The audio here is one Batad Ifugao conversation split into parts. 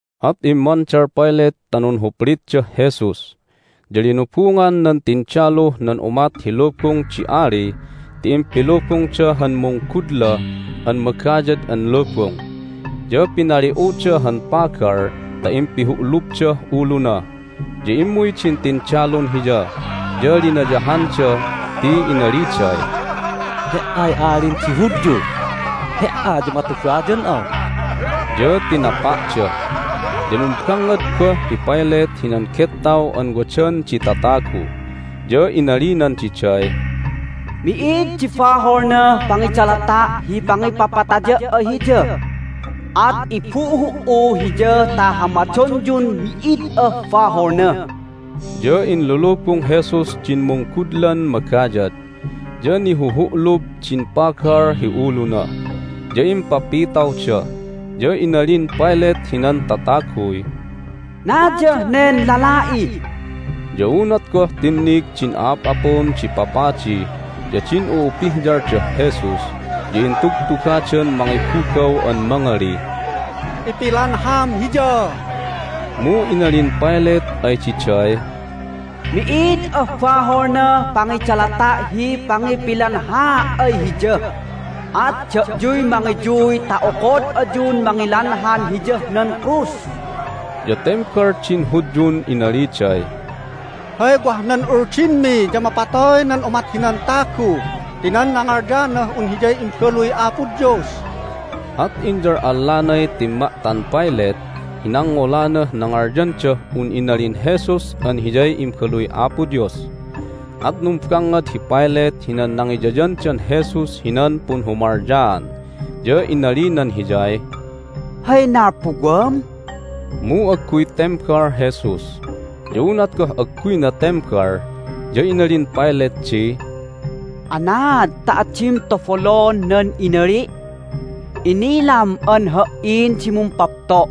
At immandal Pilate ta nunhuplitdah Jesus. Ya linubungan nan tindaluh nan umat hi lubung di ali ti impilubungda han munggudla an magayad an lubung, ya pinali'uda han pagal ta impihu'lubdah uluna. Ya immuy din tindalun Hiya, ya linayahanda ti inaliday, "He"ay Alin di Hudyu! He"a ya matubayan'a!" Ya tinapa'da. Ya numbangngad goh hi Pilate hinan gettaw an wadan di tatagu, ya inalinan diday, "Mi'id di baholnah pangidalata' hi pangipapataya' ay Hiya! At ibuhu"u Hiya ta hamadonyun mi'id ah baholna." Ya inlulubung Jesus din munggudlan magayad, ya nihuhu'lub din pagal hi uluna, ya impapitawda. Ya inalin Pilate hinan tataguy, "Nayah nen lala'i!" Ya unat goh tinnig din a'ap'apun di papadi ya din u'upihyaldah Jesus ya intugtugadan mangibugaw an mangalih, "Ipilanham Hiya!" Mu inalin Pilate ay diday, "Mi'id ah baholnah pangidalata' hi pangipilanhaa' ay Hiya! At da'yuy mangiyuy ta okod ayun mangilanhan Hiyah nan krus!" Ya tembal din Hudyun inaliday, "Hay wah nan Uldinmi ya mapatoy nan umat hinan tagu ti nan nangalyanah un Hiyay Imbaluy Apo Dios!" At inyal'allanay timma'tan Pilate hi nangngolanah nangalyandah un inalin Jesus an Hiyay Imbaluy Apo Dios. At numbangngad hi Pilate hinan nangiyayandan Jesus hinan punhumalyaan, ya inalinan Hiyay, "Hay nalpuwam?" Mu agguy tembal Jesus. Ya unat goh agguyna tembal ya inalin Pilate di, "Anaad ta adim tabolon nan inali'? Inilam an ha"in di mumpapto',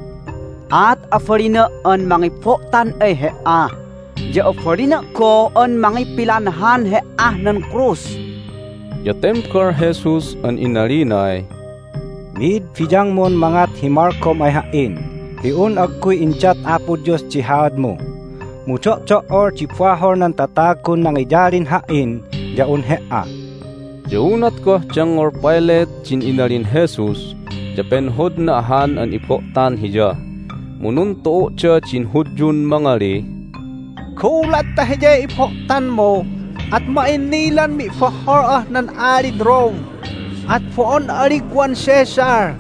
at abalina' an mangibo'tan ay He"a, ya abalina' goh an mangipilanhan He"ah nan krus!" Ya tembal Jesus an inalinay, "Mi'id biyangmun mangat hi malgom ay Ha"in hi un agguy indat Apo Dios di haadmu. Mu do'do"ol di bahol nan tatagun nangiyalin Ha"in ya un he"a." Ya unat goh dengngol Pilate din inalin Jesus ya penhodna ahan an ibo'tan Hiya. Mu nuntu'u'da din Hudyun mangalih, "Gulat ta Hiyay ibo'tanmu at ma'innilan mi'bohhol'ah nan alid Rome, at bo'on'a Ligwan Caesar!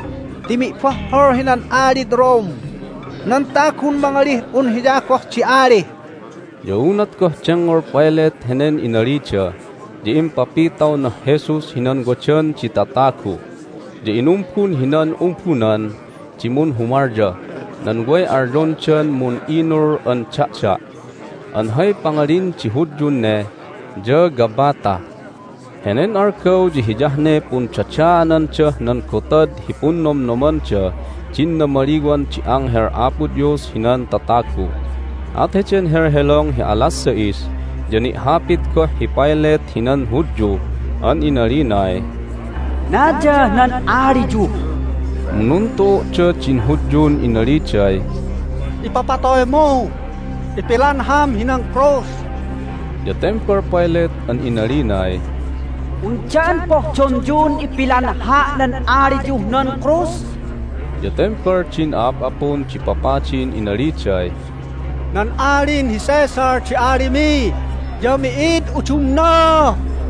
Ti mi'bohhol hinan alid Rome nan tagun mangalih un hiya goh di ali!" Ya unat goh dengngol Pilate henen inalida ya impapitawnah Jesus hinan wadan di tatagu, ya inumbun hinan umbunan di munhumalyah nan way alyondan Mun'inul an Da'da' (an hay pangalin di Hudyun ne ya Gabbatha). Henen algaw ya hiyah ne pundadaanandah nan Gotad hi Punnomnomandah din Namaliwan di Anghel Apo Dios hinan Tatagu. At heden helhelong hi alas sais ya ni'hapit goh hi Pilate hinan Hudyu an inalinay, "Naya nan aliyu!" Mu nuntu'u'da din Hudyun inaliday, "Ipapatoymu! Ipilanham hinan krus!" Ya tembal Pilate an inalinay, "Undan pohdonyun ipilanha' nan aliyuh nan krus?" Ya tembal din a'ap'apun di papadin inaliday, "Nan Alin hi Caesar di alimi, ya mi'id udumna!"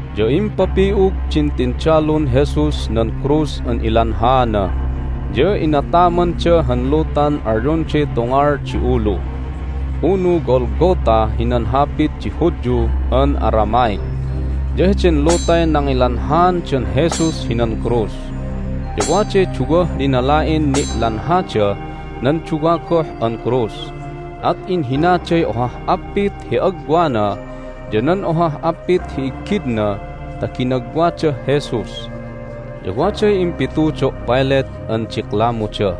Ya impapi'ug din tindalun Jesus nan krus an ilanhaana, ya inatamanda han lutan alyonday Tungal di Ulu (unu Golgatha hinan hapit di Hudyu an Aramaic). Ya heden lutay nangilanhaandan Jesus hinan krus. Ya waday duwah linala'in ni'lanhadah nan duwa goh an krus, at inhinaday ohah apit hi agwana ya nan ohah appit hi iggidna ta ginagwadah Jesus. Ya waday impitudo' Pilate an diklamuda,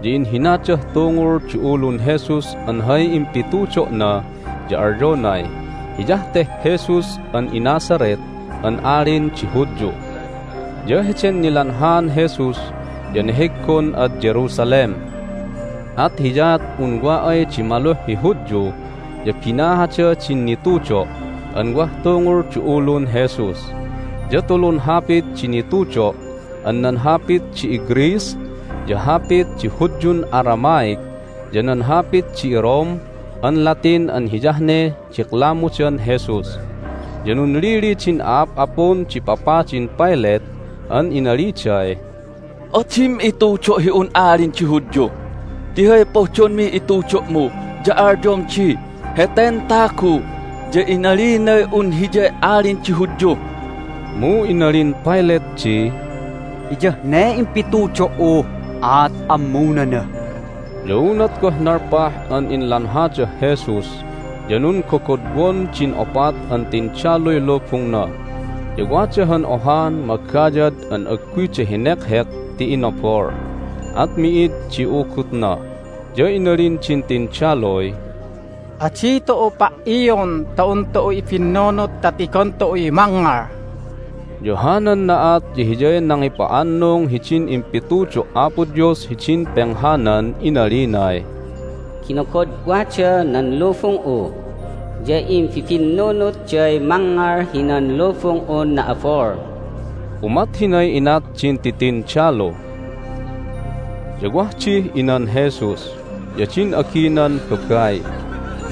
ya inhinadah tungul di ulun Jesus an hay impitudo'na ya alyonay, "Hiyah teh Jesus an iNazareth an Alin di Hudyu." Ya heden nilanhaan Jesus ya neheggon ad Jerusalem, at hiyaat un wa ay di maluh hi Hudyu ya binahada din nitudo' an wah tungul di ulun Jesus. Ya tulun hapit di nitudo' an nan hapit di iGreece, ya hapit di Hudyun Aramaic, ya nan hapit di iRome an Latin an hiyah ne diklamudan Jesus. Ya nunlili din a'ap'apun di papadin Pilate an inaliday, "Adim itudo' hi un Alin di Hudyu! Ti hay pohdonmih itudo'mu ya alyom di, Heten tagu ya inalinay un Hiyay Alin di Hudyu." Mu inalin Pilate di, "Hiyah ne impitudo"u, at ammunana!" Ya unat goh nalpah an inlanhadah Jesus ya nunggogodwon din opat an tindaluy lubungna. Ya wada han ohan magayad an agguyda henekhek ti inabol, at mi'id di ugutna. Ya inalin din tindaluy, "Adi tu'u pa"ion ta un tu'u ibinnunut ta tigon tu'uy mangngal." Ya hanan na'at ya hiyay nangipa'annung hidin impitudo' Apo Dios hidin penghanan inalinay, "Ginogodwada nan lubung'u, ya imbibinnunutday mangngal hinan lubung'un na'abol." Umat hinay inat din titindalu. Ya wah dih inan Jesus, ya din aginan babai,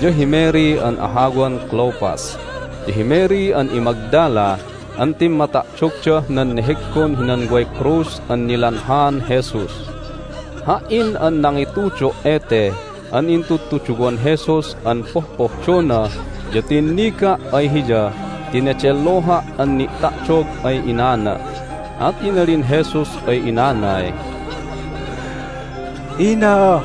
ya hi Mary an ahawan Clopas, ya hi Mary an iMagdala an timma'ta'dogdah nan neheggon hinan way krus an nilanhaan Jesus. Ha"in an nangitudo' ete an intudtuduwan Jesus an pohpohdona ya tinniga' ay Hiya ti nedelloha' an ni'ta'dog ay inana, at inalin Jesus ay inanay, "Ina,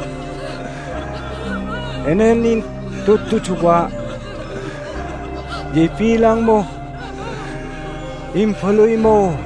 henen intudtuduwa' ya ibilangmuh imbaluymu."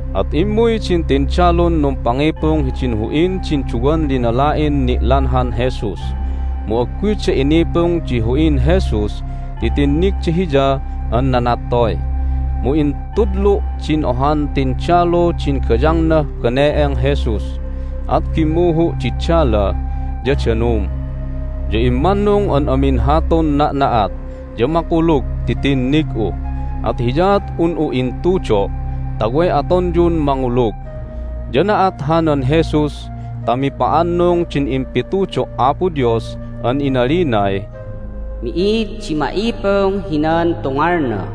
At immuy din tindalun numpangipung hidin hu'in din duwan linala'in ni'lanhan Jesus, mu agguyda inipung di hu'in Jesus ti tinnigda Hiya an nanattoy. Mu intudlu' din ohan tindalu din gayangnah bane'eng Jesus, at bimmuhu' di dala ya danum. Ya immannung an amin hatun na'na'at ya makulug ti tinnig'u, at hiyaat un'u intudo' ta way atonyun mangulug. Ya na'at hanan Jesus ta mipa'annung din impitudo' Apo Dios an inalinay, "Mi'id di ma'ipung hinan tungalna."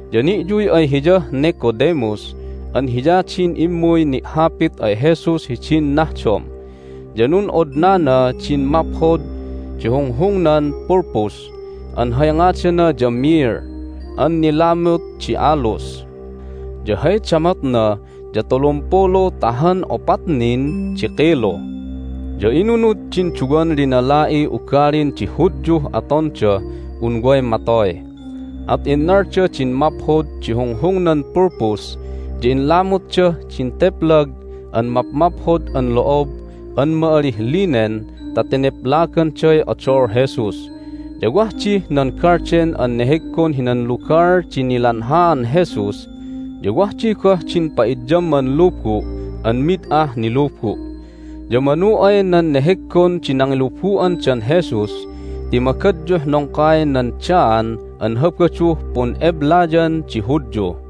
Ya ni'yuy ay hiyah Nicodemus an hiya din immuy ni'hapit ay Jesus hidin nahdom, ya nun'odnana din maphod di hunghungnan pulpus, an hay ngadana ya myrrh an nilamut di aloes. Ya hay damotna ya tulumpulu ta han opat nin di kilu. Ya inunud din duwan linala'iy ugalin di Hudyuh atondah un way matoy, at innalda din maphod di hunghungnan pulpus, ya inlamutdah din teplag an mapmaphod an lo'ob an ma'alih linen ta teneplaganday odol Jesus. Ya wah dih nan galden an neheggon hinan lugal di nilanhaan Jesus, ya wah di goh din pa'idyamman lubu' an mid ah nilubu'. Ya manu ay nan neheggon di nangilubu'andan Jesus ti magadyuh nongkay nan Daan an Habaduh pun'eblayan di Hudyu.